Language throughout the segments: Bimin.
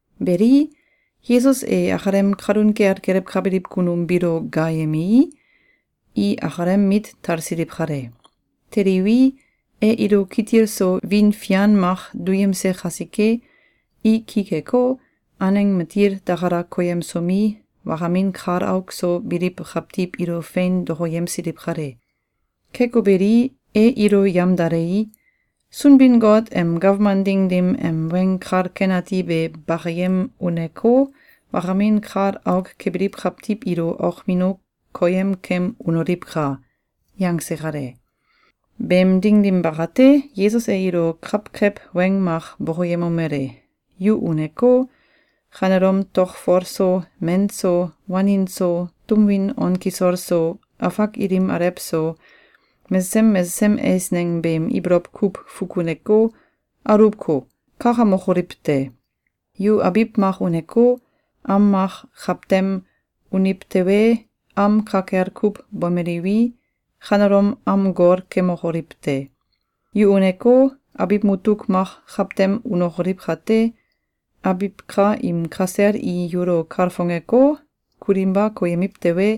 Beli, Yesus e akalem kalun kel gelewkabiliw kunum biilo gaayemei, i akalem mit talsiliw kale. Teliwi, e ilo kitil so wiin fian mak duyemse kasike, i ki keko, aneng matil takala koyemsomi, wakamin kal auk so biliw kawtiw ilo fein dokoyemsiliw kale. Keko beli, e ilo yamdalei, “Sunbin-Got em gawman ding dim em weng kal ken ati be bakayem uneko, wakamin kal auk kebiliw kawitiw ilo okmino koyemkem unoliwka!”, yangse kale. Beem ding dim bakate, Yesus e ilo kawkew weng mak bokoyemomele: “Yu uneko, kanelom tokfol so, men so, wanin so, tum win on kisol so, afak ilim alew so, mesesem mesesem eisneng beem ibolow kuw fukuneko, aluwko, kakamokoliw te! Yu abiw mak uneko, am mak kawtem uniw tewe, am ka kel kuw bomeliwi, kanelom am gol kemokoliw te! Yu uneko, abiw mutuk mak kawtem unokoliw kate, abiw ka im kasel i yulo kalfongeko, kulinba koyemiw tewe,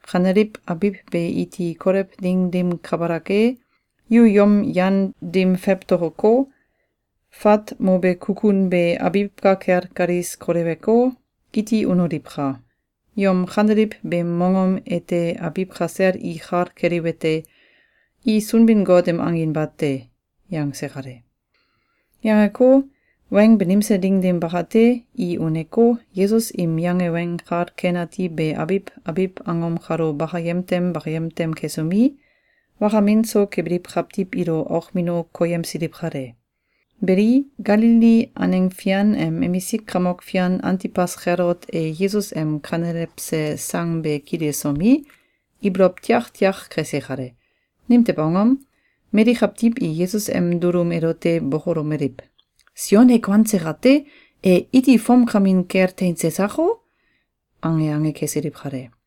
kaneliw abiw be iti kolew ding dim kabalak e, yu yom yan dim fewtokoko, fat mobe kukun be abiw ka kel kalis koleweko, iti unoliwka! Yom kaneliw beem mongom ete abiw kasel i kal keliwete: I Sunbin-Got em angin bate.”, yangse kale. Yangeko, weng banimse ding dim bakate, i uneko, Yesus im yange Weng Kal Ken Ati be abiw abiw angom kalo bakayem tem bakayem tem kesomi, wakamin so kebiliw kawtiw ilo okmino koyemsiliw kale. Beli, Galili aneng fian em emisik kamok fian Antibas Kelot e Yesus em kanelewse sang be kililsomi, ibolow tiak tiak kese kale. Nimtew angom? Mali kawtiw i Yesus em dulum elote bokolomeliw: “Sion e kuanse kate, e iti fomkamin kel teinse sako?”, ange ange kesiliw kale.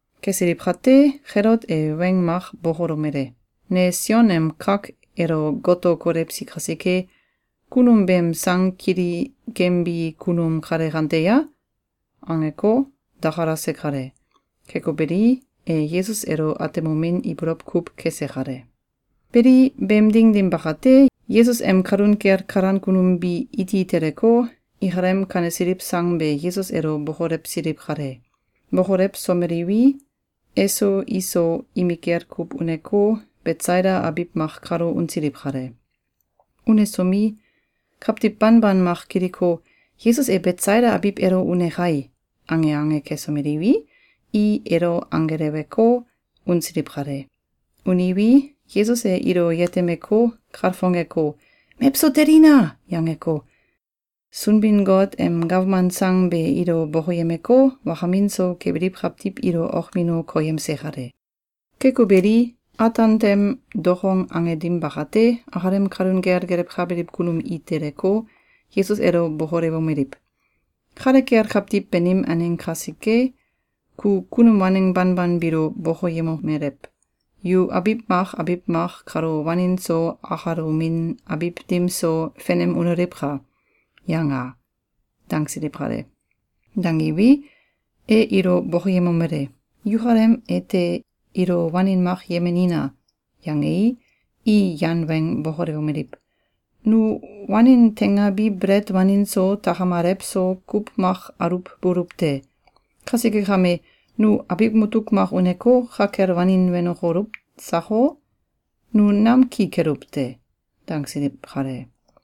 Kesiliw kate, Kelot e weng mak bokolomele: “Ne Sion em kak elo goto kolewsi kasike, kunum beem sang kili kembi kunum kale kante ya?”, angeko, dakalase kale. Keko beli, e Yesus elo atemomin ibolow kuw kese kale. Beli, beem ding dim bakate, Yesus em kalun kel kalan kunum bi iti teleko, ikalem kanesiliw sang be Yesus elo bokolewsiliw kale. Bokolewsomeliwi, eso iso imikel kuw uneko, Betsaida abiw mak kalo unsiliw kale. Unesomi, kawtiw banban mak kiliko: “Yesus e Betsaida abiw elo une kai!”, ange ange kesomeliwi, i elo anggeleweko, unsiliw kale. Uniwi, Yesus e ilo yetemeko, kalfongeko, “Mewso telina!”, yangeko, Sunbin-Got em gawman sang be ilo bokoyemeko, wakamin so kebiliw kawtiw ilo okmino koyemse kale. Keko beli, ataan tem dokong ange dim bakate, akalem kalun kel gelewkabiliw kunum i teleko, Yesus elo bokolewomeliw: “Kale kel kawtiw banim aneng kasike, ku kunum waneng banban biilo bokoyemomelew: ‘Yu abiw mak abiw mak kalo wanin so, akalomin abiw dim so, fenem unoliwka!’, yanga!”, dangsiliw kale. Dangiwi, e ilo bokoyemomele: “Yukalem ete ilo wanin mak yemenina!”, yangei, i yan weng bokolewomeliw: “Nu wanin teingabi belet wanin so, takam alew so, kuw mak aluwbuluw te! Kasike kame, nu abiw mutuk mak uneko, ka kel wanin wenokoluw sako? Nu nam ki keluw te!”, dangsiliw kale.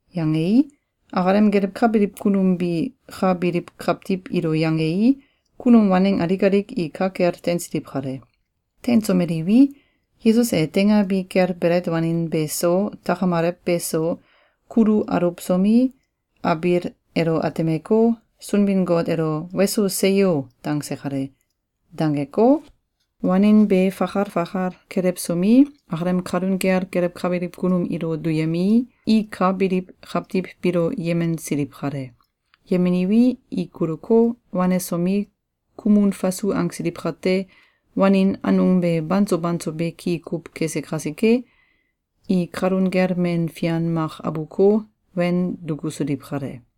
Yangei, akalem gelewkabiliw kunum bi ka biliw kawtiw ilo yangei, kunum waneng alik alik i ka kel teinsiliw kale. Teinsomeliwi, Yesus e teingabi kel belet wanin be so, takam alew be so, kulu aluwsomi, abiil elo atemeko, Sunbin-Got elo “Weso! Seyo!”, dangse kale. Dangeko, wanin be fakal fakal kelewsomi, akalem kalun kel gelewkabiliw kunum ilo duyemei, i ka biliw kawtiw biilo yemensiliw kale. Yemeniwi, i kuluko, wanesomi, kumun fasu angsiliw kate, wanin anung be banso banso beki kuw kese kasike, i kalun kel men fian mak abuko, wen dukusiliw kale.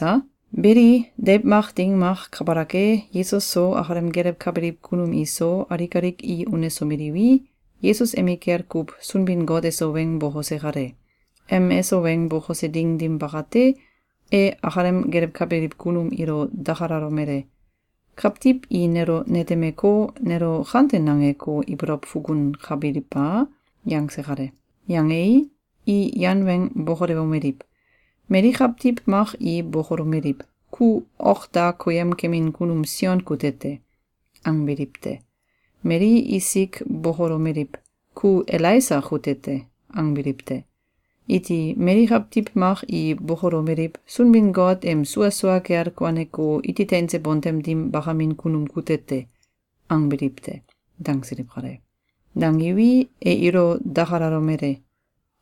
Beli, deiw mak ding mak kabalak e, Yesus so, akalem gelewkabiliw kunum iso, alik alik i unesomeliwi, Yesus emikel kuw Sunbin-Got eso weng bokose kale. Em eso weng bokose ding dim bakate, e akalem gelewkabiliw kunum ilo dakalalomele: “Kawtiw i nelo netemeko, nelo kante nangeko, ibolow fukunkabiliw a?”, yangse kale. Yangei, i yan weng bokolewomeliw: “Mali kawtiw mak i bokolomeliw: ‘Ku ok da koyem kemin kunum Sion kute te!’, angbiliw te. Mali isik bokolomeliw: ‘Ku Elaisa kute te!’, angbiliw te. Iti mali kawtiw mak i bokolomeliw: ‘Sunbin-Got em sua sua kel kuaneko, iti teinse bontem dim bakamin kunum kute te!’, angbiliw te.”, dangsiliw kale. Dangiwi, e ilo dakalalomele: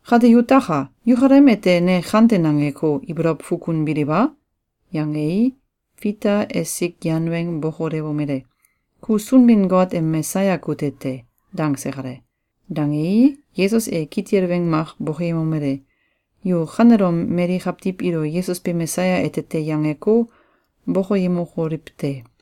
“Kate yutaka! Yukalem ete ne kante nangeko, ibolow fukunbiliw a?”, yangei, Fita esik yan weng bokolewomele: “Ku Sunbin-Got em Mesaya kute te!”, dangse kale. Dangei, Yesus e kitil weng mak bokoyemomele: “Yu kanelom mali kawtiw ilo ‘Yesus be Mesaya ete te!’, yangeko, bokoyemokoliw te!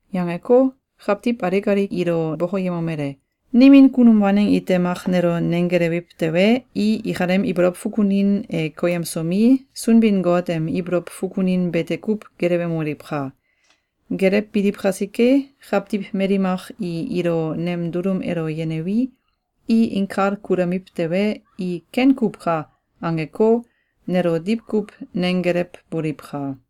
Yangeko, kawtiw alik alik ilo bokoyemomele: “Nimin kunum waneng ite mak nelo nenggelewiw tewe, i ikalem ibolow fukunin e koyemsomi, Sunbin-Got em ibolow fukunin bete kuw gelewemoliwka! Gelewbiliw kasike, kawtiw mali mak i ilo nem dulum elo yenewi, i inkal kulamiw tewe, i ‘Ken kuw ka!’, angeko, nelo diwkuw nenggelewboliwka!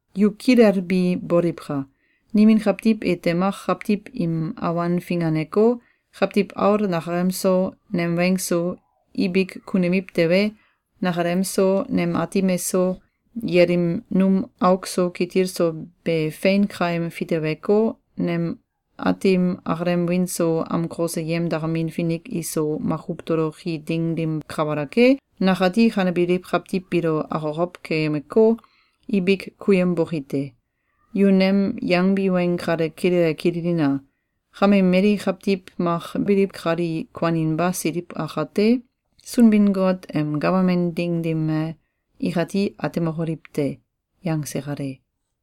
Yu kilelbi boliwka! Nimin kawtiw ite mak kawtiw im awan finganeko, Kawtiw Aul nakalem so, nem weng so, ibik kunemiw tewe, nakalem so, nem Aatim eso, yelim num auk so kitil so be fein kaim fiteweko, nem Aatim akalem wiin so amkose yemdakamin finik iso makuw toloki ding dim kabalak e, nakati kanebiliw kawtiw biilo akokow keyemeko, ibik kuyemboki te. Yu nem yangbi weng kale kilele kililina! Kame mali kawtiw mak biliw kali kuaninba siliw akate, Sunbin-Got em gawman ding dim e, ikati atemokoliw te.”, yangse kale.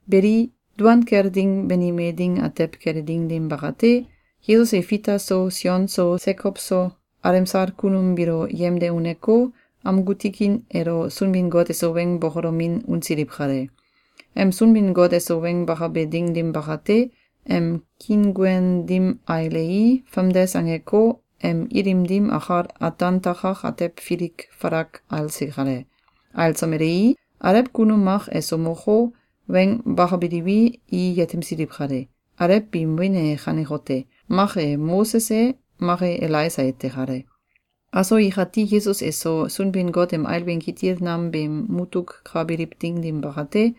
Beli, duan kel ding banime ding atew kele ding dim bakate, Yesus e Fita so, Sion so, Sekow so, alemsal kunum biilo yemde uneko, amgu tikin elo Sunbin-Got eso weng bokolomin unsiliw kale. Em Sunbin-Got eso weng bakabe ding dim bakate, em kiinguen dim ailei, famdes angeko, em ilim dim akal ataan takak atew filik falak ailse kale. Ailsomelei, alew kunum mak eso moko, weng bakabiliwi, i yetemsiliw kale. Alew biim wiin e kanekote: Mak e Moses e, mak e Elaisa ete kale. Aso ikati Yesus eso Sunbin-Got em ailbin kitil nam beem mutuk ka biliw ding dim bakate,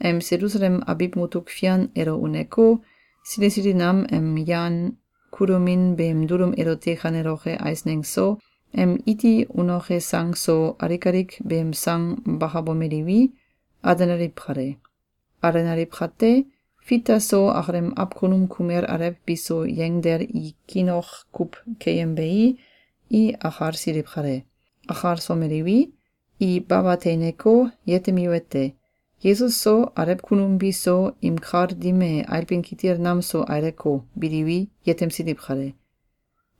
em Selusalem abiw mutuk fian elo uneko, sili sili nam em yan kulomin beem dulum elote kaneloke eisneng so, em iti unoke sang so, alik alik beem sang bakabomeliwi, alenaliw kale. Alenaliw kate, Fita so akalem awkunum kumel alew biso yengdel i kiin ok kuw keyembei, i akalsiliw kale. Akalsomeliwi, i baba teineko, yetemiwete: Yesus so alew kunum biso im kal dim e ailbin kitil nam so aileko, biliwi, yetemsiliw kale.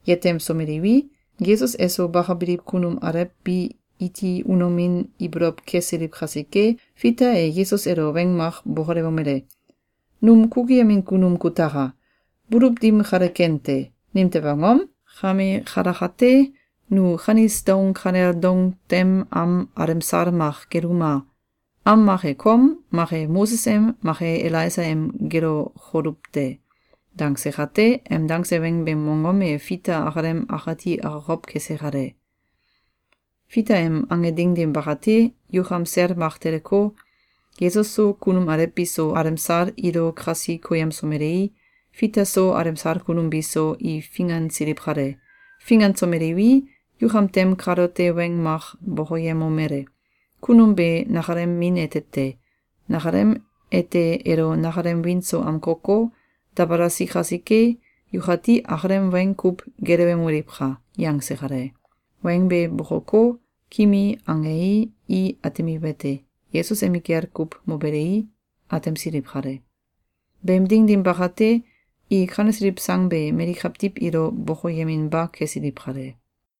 Yetemsomeliwi, Yesus eso bakabiliw kunum alew bi iti unomin ibolow kesiliw kasike, Fita e Yesus elo weng mak bokolewomele: “Num kukuyemin kunum kutaka! Buluw dim kale ken te. Nimtew angom? Kame kalakate, nu kanis doung kanel doung tem am alemsal mak geluma! Am mak e kom, mak e Moses em, mak e Elaisa em gelokoluw te.”, dangse kate, em dange weng beem mongom e Fita akalem akati akokow kese kale. Fita em ange ding dim bakate, yukam sel mak teleko, Yesus so, kunum alew biso, alemsal ilo kasi koyemsomelei, Fita so, alemsal kunum biso, i fingansiliw kale. Fingansomeliwi, yukam tem kalote weng mak bokoyemomele: “Kunum be nakalem min ete te! Nakalem ete elo nakalem wiin so amkoko, dabalasi kasike, yukati akalem weng kuw gelewemoliwka!”, yangse kale. Weng be bokoko, kimi angei, i atemiwete: Yesus emikel kuw mobelei, atemsiliw kale. Beem ding dim bakate, i kanesiliw sang be mali kawtiw ilo bokoyeminba kesiliw kale.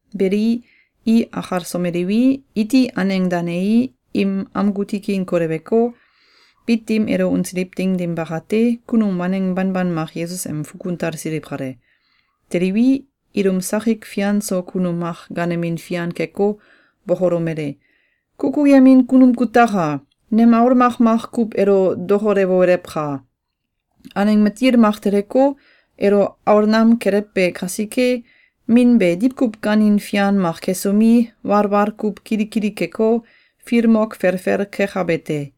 Beli, i akalsomeliwi, iti aneng danei, im amgu tikin koleweko, bit dim elo unsiliw ding dim bakate, kunum waneng banban mak Yesus em fukun talsiliw kale. Teliwi, ilum sakik fian so kunum mak gaanemin fian keko, bokolomele: “Kukuyemin kunum kutaka! Nem aul makmak kuw elo dokolewolewka! Aneng matil mak teleko, elo aol nam kelewbe kasike, min be diwkuw gaanin fian mak kesomi, walwal kuw kili kili keko, filmok felfel kekabe te.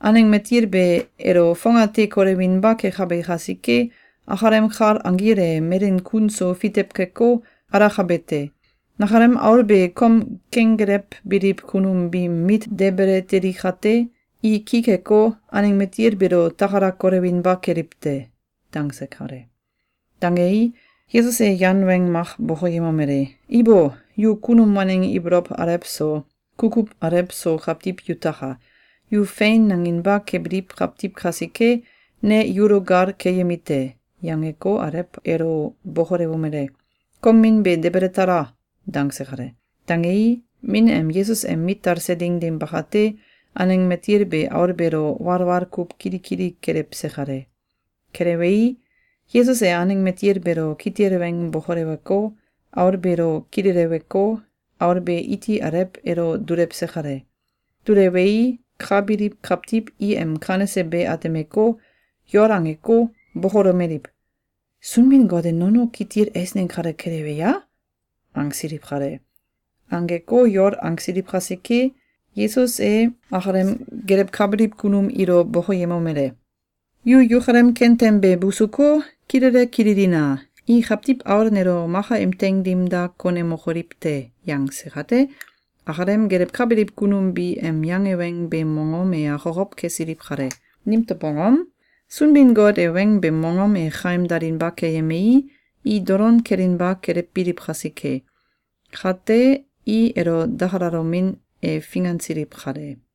Aneng matil be elo fongate kolewinba kekabe kasike, akalem kal anggil e melen kun so fitew keko, alakabe te. Nakalem aul be kom kenggelewbiliw kunum biim mit debele teli kate, i ki keko, aneng matil beelo takala kolewinba keliw te.”, dangse kale. Dangei, Yesus e yan weng mak bokoyemomele: “Ibo! Yu kunum waneng ibolow alew so, kukuw alew so kawtiw yutaka! Yu fein nanginba kebiliw kawtiw kasike, ne yulo gal keyemi te!”, yangeko, alew elo bokolewomele: “Kom min be debele tala!”, dangse kale. Dangei, min em Yesus em mit talse ding dim bakate, aneng matil be aul beelo walwal kuw kili kili kelewse kale. Kelewei, Yesus e aneng matil beelo kitil weng bokoleweko, aul beelo kileleweko, aul be iti alew elo dulewse kale. Dulewei, ka biliw kawtiw i em kanese be atemeko, yol angeko, bokolomeliw: “Sunbin-Got e nono kitil eisneng kale kelewe ya?”, angsiliw kale. Angeko yol angsiliw kasike, Yesus e akalem gelewkabiliw kunum ilo bokoyemomele: “Yu yukalem kentem be busuko, kilele kililina! I Kawtiw Aul nelo maka im teing dim da konemokoliw te!”, yangse kate, akalem gelewkabiliw kunum bi em yange weng beem mongom e akokow kesiliw kale. Nimtew angom? Sunbin-Got e weng beem mongom e kaim dalinba keyemei, i dolon kelinba kelewbiliw kasike. Kate, i elo dakalalomin e fingansiliw kale.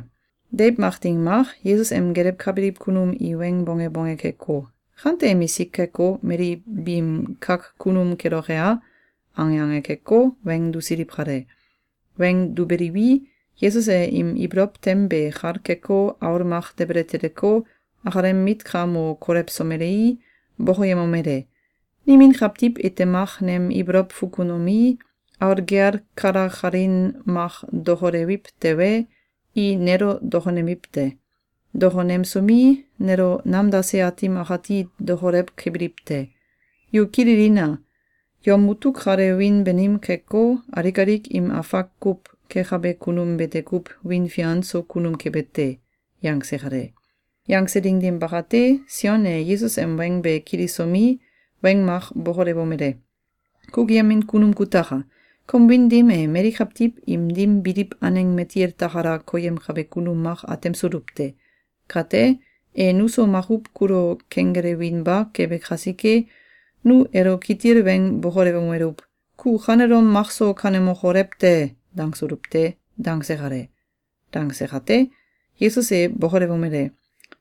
Deiw mak ding mak, Yesus em gelewkabiliw kunum i weng bonge bonge keko, “Kante emisk keko, mali biim kak kunum keloke a?”, ange ange keko, weng dusiliw kale. Weng dubeliwi, Yesus e im ibolow tem be kal keko, aul mak debele teleko, akalem mit ka mo kolewsomelei, bokoyemomele: “Nimin kawtiw ite mak nem ibolow fukunomi, aul gel kalakalin mak dokolewiw tewe, i nelo dokonemiw te. Dokonemsomi, nelo namdase Aatim akati dokolew kebiliw te. Yu kililina! Yom mutuk kale wiin banim keko, alik alik im afak kuw kekabe kunum bete kuw wiin fian so kunum kebe te.”, yangse kale. Yangse ding dim bakate, Sion e Yesus em weng be kilisomi, weng mak bokolewomele: “Kukuyemin kunum kutaka! Kom wiin dim e mali kawtiw im dim biliw aneng matil takala koyemkabe kunum mak atemsuluw te. Kate, e nuso makuw kulo kenggelewinba kebe kasike, nu elo kitil weng bokolewomeluw: ‘Ku kanelom makso kanemokolew te!’, dangsuluw te.”, dangse kale. Dangse kate, Yesus e bokolewomele: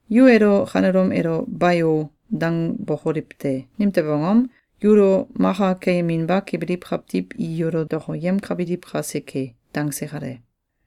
“Yu elo kanelom elo ‘Bayo!’, dangbokoliw te! Nimtew angom? Yulo maka keyeminba kebiliw kawtiw i yulo dokoyemkabiliw kasike!”, dangse kale.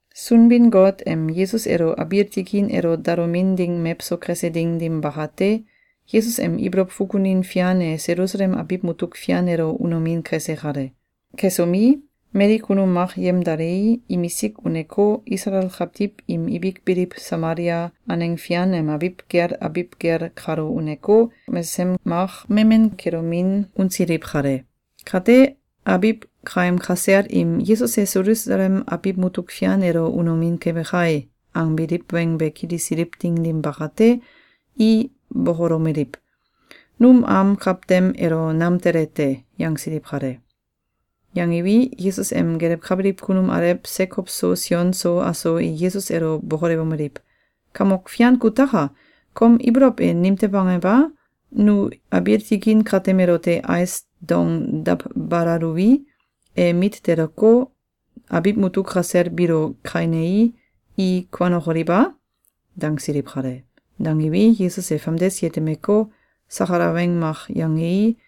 Sunbin-Got em Yesus elo abiil tikin elo dalomin ding mewso kese ding dim bakate, Yesus em ibolow fukunin fian e Selusalem abiw mutuk fian elo unomin kese kale. Kesomi, mali kunum mak yemdalei, imisik uneko, Isalael kawtiw im ibik biliw Samalia aneng fian em abiw gel abiw gel kalo uneko, mesesem mak memen kelomin unsiliw kale. Kate, abiw kaem kasel im “Yesus e Selusalem abiw mutuk fian elo unomin kebe kai!”, angbiliw weng be kilisiliw ding dim bakate, i bokolomeliw: “Num am kawtem elo nam tele te!”, yangsiliw kale. Yangiwi, Yesus em gelewkabiliw kunum alew Sekow so Sion so aso i Yesus elo bokolewomeliw: “Kamok Fian kutaka! Kom ibolow e nimtew angew a? Nu abiil tikin katem elote ais dong dawbalaluwi, e mit teleko, abiw mutuk kasel biilo kainei, i kuanokoliw a?”, dangsiliw kale. Dangiwi, Yesus e famdes yetemeko, sakala weng mak yangei,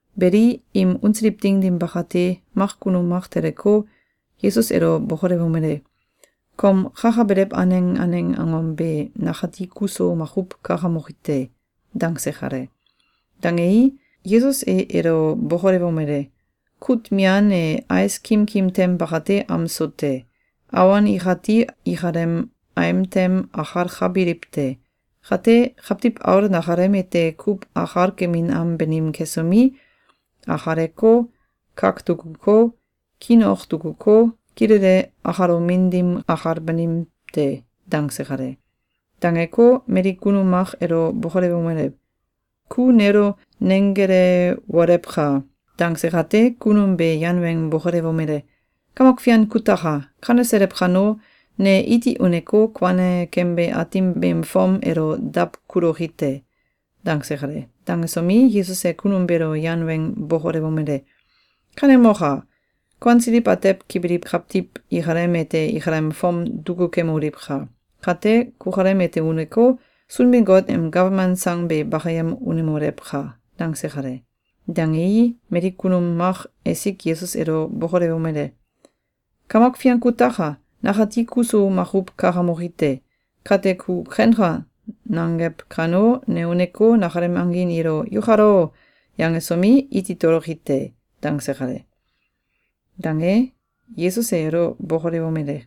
Beli, im unsiliw ding dim bakate, mak kunum mak teleko, Yesus elo bokolewomele: “Kom kakabelew aneng aneng angom be nakati kuso makuw kakamoki te.”, dangse kale. Dangei, Yesus e elo bokolewomele: “Kut mian e ais kimkim tem bakate am so te. Awon ikati ikalem aim tem akalkabiliw te. Kate, Kawtiw Aul nakalem ete kuw akalkemin am banim kesomi, akaleko, kak dukuko, kiin ok dukuko, kilele akalomin dim akal banim te.”, dangse kale. Dangeko, mali kunum mak elo bokolewomele: “Ku nelo nenggelewolewka!”, dangse kate, kunum be yan weng bokolewomele: “Kamok Fian kutaka! Kaneselew kano, ne iti uneko, kuane kembe aatim beem fom elo dawkuloki te!”, dangse kale. Dangesomi, Yesus e kunum beelo yan weng bokolewomele: “Kanemoka! Kuansiliw atew kebiliw kawtiw ikalem ete ikalem fom dukukemoliwka! Kate kukalem ete uneko, Sunbin-Got em gawman sang be bakayem unemolewka!”, dangse kale. Dangei, mali kunum mak esik Yesus elo bokolewomele: “Kamok Fian kutaka! Nakati kuso makuw kakamoki te! Kate, ku ‘Kenka!’, nangew kano, ne uneko, nakalem angin ilo ‘Yukal o!’, yangesomi, iti toloki te!”, dangse kale. Dange, Yesus e elo bokolewomele: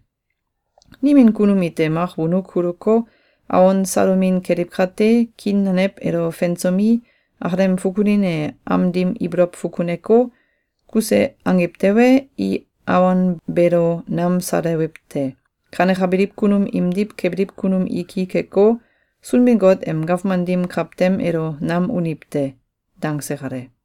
“Nimin kunum ite mak wonuk kuluko, awon salomin keliw kate, kiin nanew elo fensomi, akalem fukunin e am dim ibolow fukuneko, kuse angiw tewe, i awon beelo nam salewiw te. Kanekabiliw kunum imdiw kebiliw kunum i ki keko, Sunbin-Got em gawman dim kawtem elo nam uniw te!”, dangse kale.